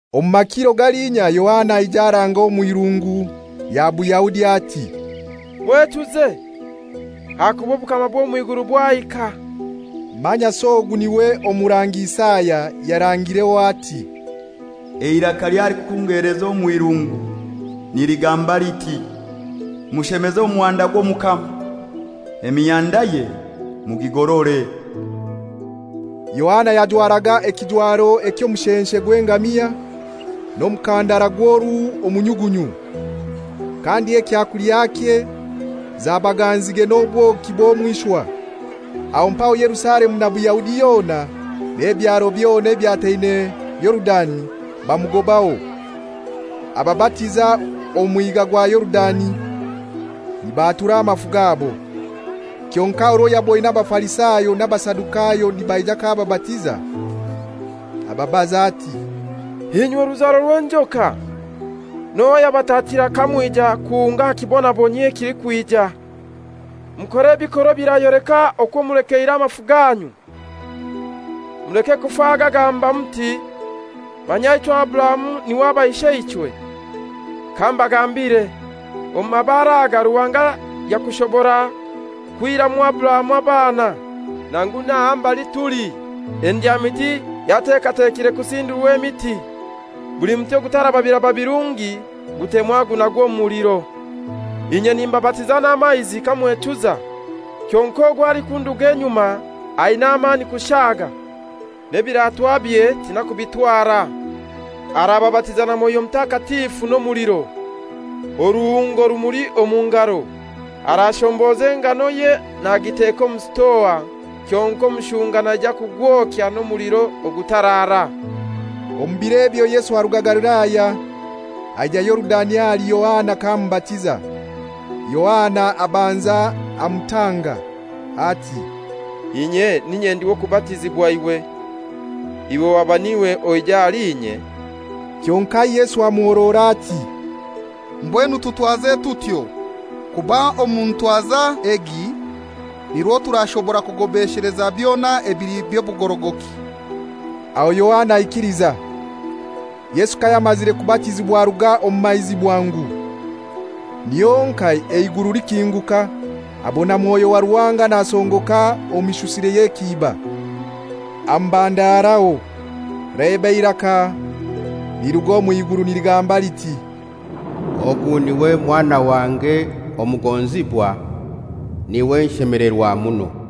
Omu makiro galiinya Yohana aija aranga omw'irungu lya Buyahudi, ati, «Mwechuze, ahakuba obukama bw'omw'iguru bwahika.» Manyasi ogu niwe Omurangi Isaya yarangireho ati, «Eiraka ly'alikukungeleza omw'irungu niligamba liti, ‹Mushemeze omuhanda gw'Omukama, emihandaye mugigorore.›» Yohana yajwaraga ekijwaro eky'omushenshe gw'engamia, n'omukandara gw'oruhu omu nyugunyu. Kandi ekyakulyakye zabaga nzige n'obwoki bw'omw'ishwa. Aho mpaho Yerusalemu na Buyahudi yona n'ebyaro byona ebyataine Yorudani bamugobaho. Ababatiza omu mwiga gwa Yorudani nibaatura amafu gabo. Kyonkai orwo yaboine Abafarisayo n'Abasadukayo nibaija k'ababatiza, ababaza ati, «Inywe ruzaro rw'enjoka, n'ohai ayabatatira kamwija kuhunga aha kibonabonyio ekilikwija? Mukore ebikorwa ebirayoleka okwo mulekeire amafu ganyu. Muleke kufa gagamba muti, ‹Manya ichwe Aburahamu niwe aba isheichwe!› Kambagambire, omu mabare aga Ruhanga yakushobora kwihiramu Aburahamu abaana. Nangu n'aha mbali tuli endyamiti yatekatekirwe kusindura emiti. Buli muti ogutaraba biraba birungi gutemwa gunagwa omu muliro.» «Inye nimbabatiza n'amaizi kamwechuza, kyonkai ogwo alikunduga enyuma aina amani kushaga, n'enkaitoze tinakubitwara. Arababatiza na Mwoyo Mutakatifu n'ebiratwabye. Oruhungo rumuli omu ngaro, arashomboza enganoye nagiteka omu sitoa, kyonkai omushunga naija kugwokya n'omuliro ogutarara.» Omu bir'ebyo Yesu aruga Galilaya aija Yorudani ahali Yohana k'amubatiza. Yohana abanza amutanga ati, «Inye n'inye ndi w'okubatizibwa iwe, iwe waba n'iwe oija ahali inye?» Kyonkai Yesu amuhorora ati, «Mbwenu tutwaze tutyo! Kuba omu ntwaza egi nirwo turashobora kugobesheleza byona ebili by'obugorogoki.» Aho Yohana aikiliza. Yesu kayamazire kubatizibwa aruga omu maizi bwangu, niho honkai eiguru likinguka, abona Mwoyo wa Ruhanga nasongoka omu mishusire y'ekiiba, amubandaraho. Leba, eiraka liruga omw'iguru niligamba liti, «Ogu niwe mwana wange omugonzibwa, niwe nshemelerwa muno.»